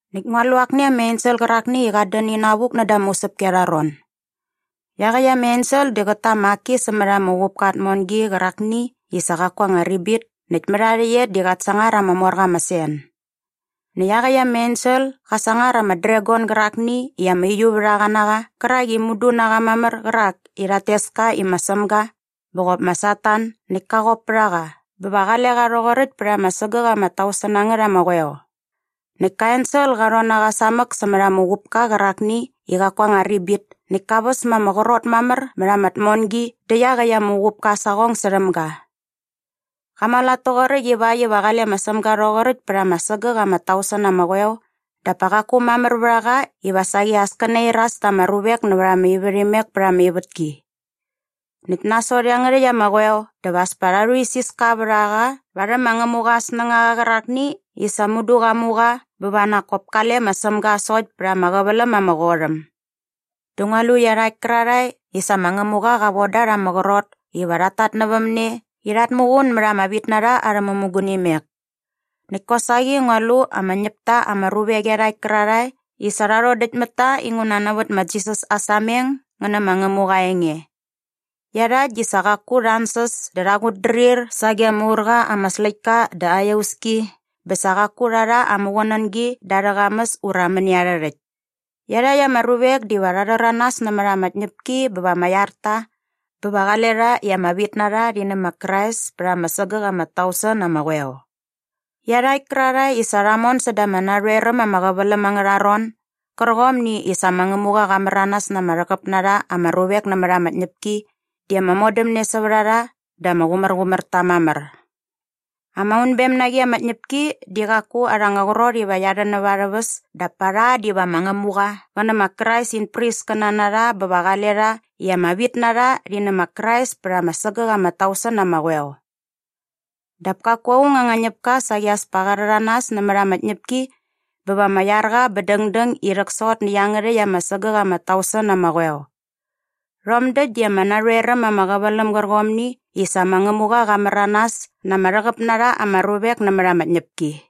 Näkt ngua lu akni ama ensel qärakni i qat dän inavuk näda ama usäpki arha ron. Iaqäkt ama ensel di qät ta ama aki sämät ama uqupka aa tmongi qärakni i sa qaku aa anga ribit näkt mät aa rhäqyet di qat sangar ama mor qa ama sen. Näkt iaqäkt ama ensel qa sangar ama dragon gärakni i ama uiuvärhaqa na qa qärak i mudu na qa mamär qärak i rhat tes ka i ma Sämga bä qop ma Satan näkt ka qop pät a qa bä va qale qa rhoqoräkt pät ama sägäk ama tausen na ngät ama qoeo. Näkt ka ensel qa rhon na qa sämät ama uqupka qärakni i qaku aa anga ribit näkt ka väs ma ama qrot mamär mät ama tmongi dä iaqäkt ama uqupka aa saqong särhäm ga. Qa mualat toqoräkt ivakt iva qale ma Sämga rhoqoräkt pät ama sägäk ama tausen na ama qoeo dap pa qaku mamär vät a qa iva saqi as kä nairas ta ama ruvek nävät ama ivärhimek pät ama ivätki. Näkt nasot iangärhäkt ama qoeo dä va as pa rha rhuisiska vät a qa varhäm mä Ngämuqa aa snängaqa qärakni i sa mudu qa mu qa bä va nak kop kale ma Sämga sokt pät ama qäväläm ama qot äm. Dä ngua lu iarhakt kärarhae i sa ma Ngämuqa qa von da rha ama qrot iva rhat tatnävämne i rhat muqun mät ama vitnarha arhä mämugunimek. Näkt kosaqi ngua lu ama ñäpta ama ruvek iarhakt kärarhae i sa rha rhodäkt mät ta inguna nävät ma Jisas aa sameng ngä nä ma Ngämuqa aa enge. Iarhakt di sa qaku rha ansäs dä rha qutdrir sage ama ur qa ama släktka dä aa iauski bä sa qaku rha rha aa muqunängi da arhä qamäs ura mäni arhä rhäkt. Iarhakt ama ruvek diva rha rhäranas nämät ama tñäpki bä va ama iar ta bä va qale rha i ama vitnarha rhi nä ma Krais pät ama sägäk ama tausen na ama qoeo. Iarhakt kärarhae i sa rha mon säda ama narhoer äm ama qäväläm angärha ron gärqomni i sa ma Ngämuqa qa märanas na ama rhäqäp na rha ama ruvek nämät ama tñäpki di ama modämne sävät a rha dä ama qumärqumär ta mamär. Ama unbem na qi ama tñäpki di qaku arha anga qrot iva qia rhän näva arhä väs dap pa rha diva ma Ngämuqa qä nä ma Krais in priskäna na rha bä va qale rha i ama vitnarha rhi nä ma Krais pät ama sägäk ama tausen na ama qoeo. Dap kaku aung anga ñäpka saqi as pa qa rhäranas nämät ama tñäpki bä va ama iar qa bä dängdäng i rhäksot nä iangärhäkt ama sägäk ama tausen na ama qoeo. Rhom däkt di ama narhoer äm ama qäväläm gärqomni i sa ma Ngämuqa qa märanas na ama rhäqäp na rha ama ruvek nämät ama tñäpki.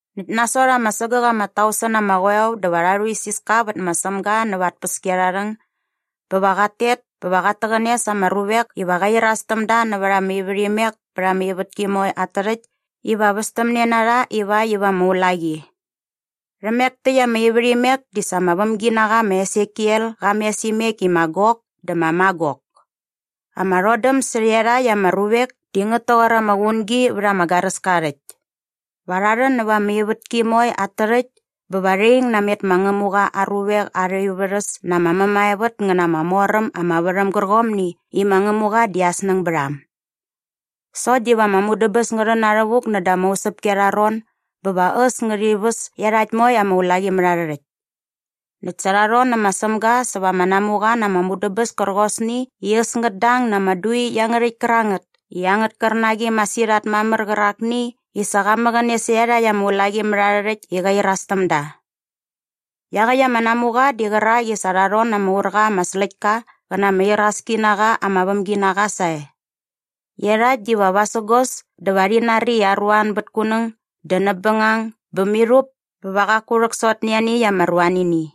Näkt nasot ama sägäk ama tausen na ama qoeo dä va rha rhuisiska vät ma Sämga näva aa tpäskiarharhäng bä va qat tet bä va qat täqäne sa ama ruvek iva qä iras täm da nävät ama ivärhimek pät ama ivätki moe at tärhäkt iva västämne na rha ivakt iva ama ulaqi. Rhämek täkt ama ivärhimek di sa ama vämginaqa ma Esekiel qa mes imek i ma Gok dä ma Magok. Ama rhodäm sä iarhakt ama ruvek di ngät toqor ama qungi vät ama garäska aa rhäkt. Va rha rhän nävät ama ivätki moe at tärhäkt bä va rhi ing namet ma Ngämuqa aa ruvek arha ivärhäs na ama mämaevät ngä na ama mor äm ama värhäm gärqomni i ma Ngämuqa di aa snäng bät a äm. Sokt diva ama mudäbäs ngä rhän na rhävuk näda ama usäpki arha ron bä va äs ngärhi väs iarhakt moe ama ulaqimärharhärhäkt. Näkt sa rha rhon nä ma Sämga säva ama namuqa na ama mudäbäs kärqosni i äs ngät dang na ama dui iangärhäkt kärangät i angät kärnaqi masirhat mamär qärakni i sa qa mäqäne sä iarhakt ama ulaqimärharhärhäkt i qa iras täm da. Iaqäkt ama namuqa di qärak i sa rha rhon na ama ur qa ama släktka qä na ama iraski na qa ama vämginaqa sae. Iarhakt diva vasägos dä va rhi nari i aruan bät kunäng dä näp bängang bä mirhup bä va qaku rhäksot nä ianiäkt ama ruanini.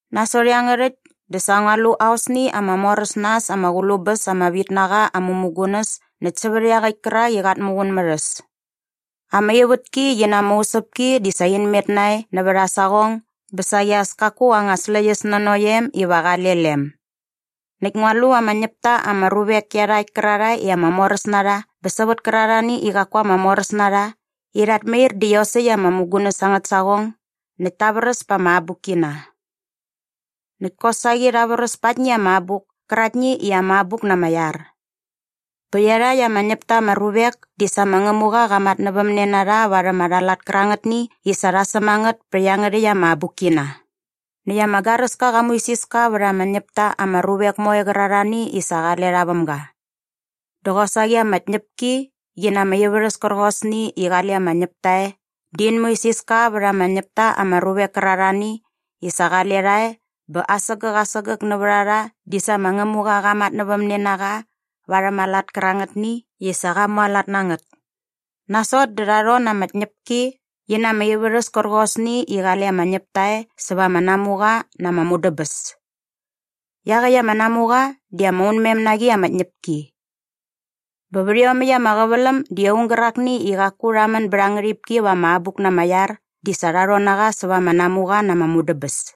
Nasot iangärhäkt dä sa ngua lu aosni ama mor äs na äs ama qulu bäs ama vitnaqa aa mämugunäs näkt sävät iaqäkt kärak i qat muqun mät äs. Ama ivätki qi na ama usäpki di sa in met nae nävät aa saqong bä saqi as kaku anga släqyäs nanokt em iva qale lem. Näkt ngua lu ama ñäpta ama ruvek iarhakt kärarhae i ama moräs na rha bä sävät kärarhani i qaku ama moräs na rha i rhat mair da iosäkt ama mämugunäs angät saqong näkt ta vräs pa ama abukkina. Näkt kosaqi rha vräs pa aktni ama abuk käraktni i ama abuk na ama iar. Bä iarhakt ama ñäp ta ama ruvek di sa ma Ngämuqa qa matnävämne na rha varhäm arha lat kärangätni i sa rha säm a ngät pä iangärhäkt ama abukkina. Näkt ama garäska qa muisiska vät ama ñäp ta ama ruvek moe qärarhani i sa qale rha väm ga. Dä qosaqi ama tñäpki qi na ama ivärhäs kärqosni i qale ama ñäpta e di in muisiska vät ama ñäp ta ama ruvek kärarhani i sa qale rha e bä asägäk asägäk nävät a rha di sa ma Ngämuqa qa matnävämne na qa varhäm aa lat kärangätni i sa qa mualat na ngät. Nasot dä rha rhon na ama tñäpki qi na ama ivärhäs kärqosni i qale ama ñäpta e säva ama namuqa na ama mudäbäs. Iaqäkt ama namuqa di ama unmem na qi ama tñäpki. Bä vät iomäkt ama qäväläm di aung gärakni i qaku rha män bät aa ngärhipki va ama abuk na ama iar di sa rha rhon na qa säva ama namuqa na ama mudäbäs.